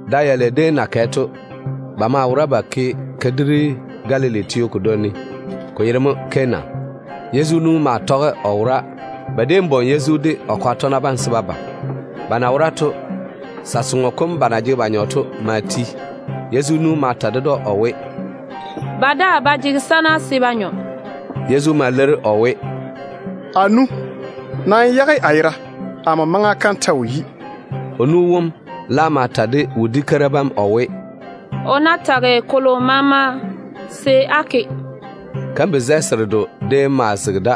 Da yatɔ dɛ dem déem na yi to, ba maa wora ba ke kadiri Galili teo kodwoŋi ne, ko yere mo Kana. Yezu nu maa tɔge o wora. Ba déem bwoŋi Yezu de o kwaga tɔgena bam mo se ba de ba da. Ba na wora to, sa-soŋo kom ba na jege ba nyɔ to ma ti. Yezu nu ma ta ded‑o o we, “Ba daa ba jege sana se ba nyɔ.” Yezu ma leiri o we, “A nu, nam yage a yera. Amo maŋa kam ta wo yi.” O nu wom laam ma ta de wodi-keira bam o we, “O ná tage kolo maama, se á ke.” Kambi-zɛ seredo déem maa zege da.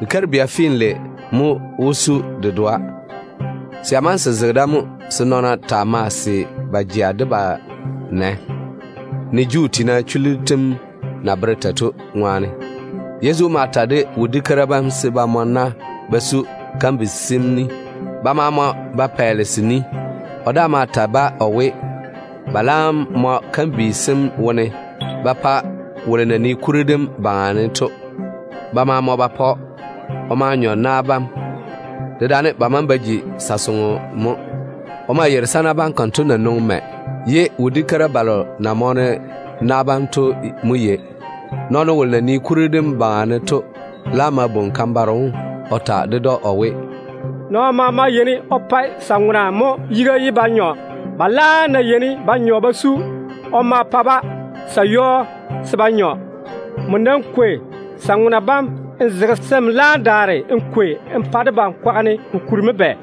Kikeiri-bia finlei naa fintɔ mo wó su se dedoa. Se ya maŋe se zege da mo se nɔɔna taa mae se wo na bam ba se ba jea de ba nɛ, ne Juu tiina chullu tem na bere tei to. Yezu ma ta de wodiu keira bam se ba mɔ na ba su kambi sem ni. Ba ma mɔ ba pɛɛle se ni. O daa ma ta-ba o we, ba laam mɔ kambi sem wone ba ja ba vo ba pa wolo na nii kuri dem baŋa ne to. Ba ma seene ba ke konto. O ma nyɔ na bam, dedaane ba maŋe ba ji sa-soŋo mo. O ma yeiri sana bam konto na nwoŋi mɛ, ye wodi-keira balo na mɔɔne na bam to mo yei. Nɔɔno wolo na nii kuri dem baŋa ne to laam ma bwoŋi kan-baro wom o ta ded‑o o we, “Nɔɔno maama yeini o pa sa-ŋona mo yiga ye ba nyɔ. Ba laam ná yeini ba nyɔ ba su, o ma pa-ba sa-yɔɔ se ba nyɔ. Nmo nam kwei sa-ŋona bam n zege, se n laam daare n kwei n pa debam kwaga ne. Ko kuri mo bɛ?”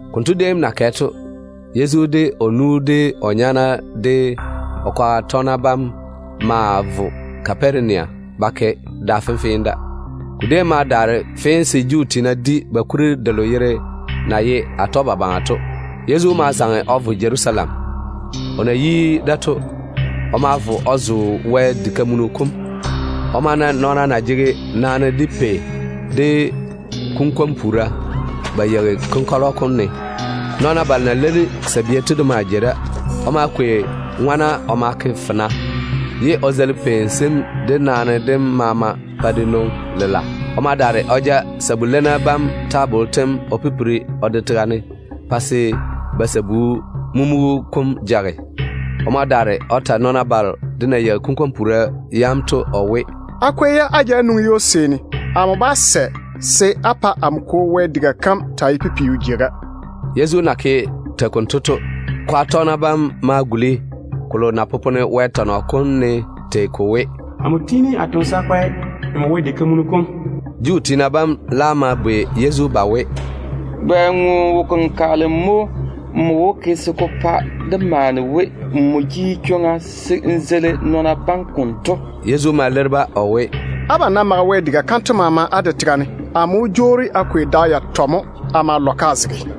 Konto déem na kɛ to, Yezu, de o nu, de o nyaana, de o kwaga tɔgena bam ma vo Kaparenia ba ke da fenfee da. Ko déem ma daare fee se Juu tiina di ba kuri delo yere na ye Atɔgebabaŋa to. Yezu ma zaŋe o vo Jerusalem. O na yi da to, o ma vo o zo Wɛ diga kam. O ma na nɔɔna na jege naane, de pei, de kunkwon-puura ba yeiga ka konkɔlɔ kom ne. Nɔɔna balo na leini sabia to de maa jei da. O ma kwei ŋone o ma ke fena, ye o daare o zeili pei sem de naane dem maama pa de nwoŋi lela. O ma ja sabu-leinna bam tabollo o pipiri o de tega ne pa se ba sabu-mumugu kom jage. O ma daare o ta nɔɔna balo de na yeigi kunkwon-puura bam to o we, “Nam kwei-ba á ja á nwoŋi ywo-seeni. Amo bá sɛ se á pa amo Kwo Wɛ sɔŋɔ kom taa ye pipiu jeiga.” Yezu na ke tei konto to, o kwaga tɔgena bam ma guli ko na popone Wɛ tɔnɔ kom ne tei ko we, “Amo tiini a toŋe de yi-seena a pa nmo wara-jei sem mo.” Juu tiina bam laam ma bwei Yezu ba we, “Bɛ ŋo wo-kenkagele mo nmo wó ke se ko pa dé maane we nmo jege chwoŋa se n zeili nɔɔna bam konto?” Yezu ma leiri-ba o we, “Abam ná mage Wɛ diga kanto maama á de tega ne, amo wó jwoori a kwei da yatɔ mo a ma lɔ-ka a zege.”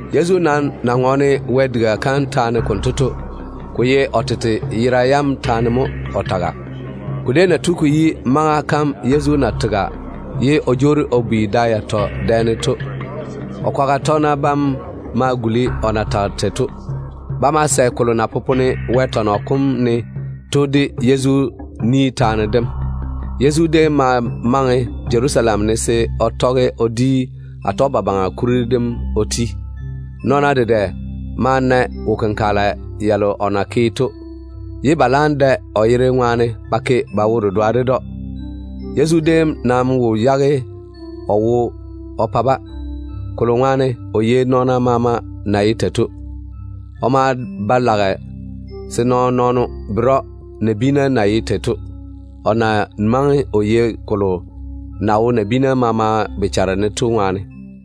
Yezu nam na ŋɔɔne Wɛ diga kam taane konto to, ko ye o tete yera yam taane mo o taga. Ko déem na tu ko yi maŋa kam Yezu na tega, ye o jwoori o bi da yatɔ dɛ ne to, o kwaga tɔgena bam laam guli o na tage tei to. Ba ma sɛ kolo na popone Wɛ tɔnɔ kom ne to de Yezu ni taane dem. Yezu déem ma maŋe Jerusalem ne se o tɔge o di Atɔgebabaŋa kuri dem o ti. Nɔɔna dedɛ ma na wo-kenkagela yalo o na ke to, pa se ba da o yere ŋwaane ba ke ba wo-dedoa ded‑o. Yezu déem nam wo yage o wo o pa-ba, kolo ŋwaane o yei nɔɔna maama na ye tei to. O maa ba lage se nɔɔn-nɔɔno bere‑o nabiina na ye tei to, o na maŋe o yei kolo na wo nabiinu maama bochare ne to ŋwaane.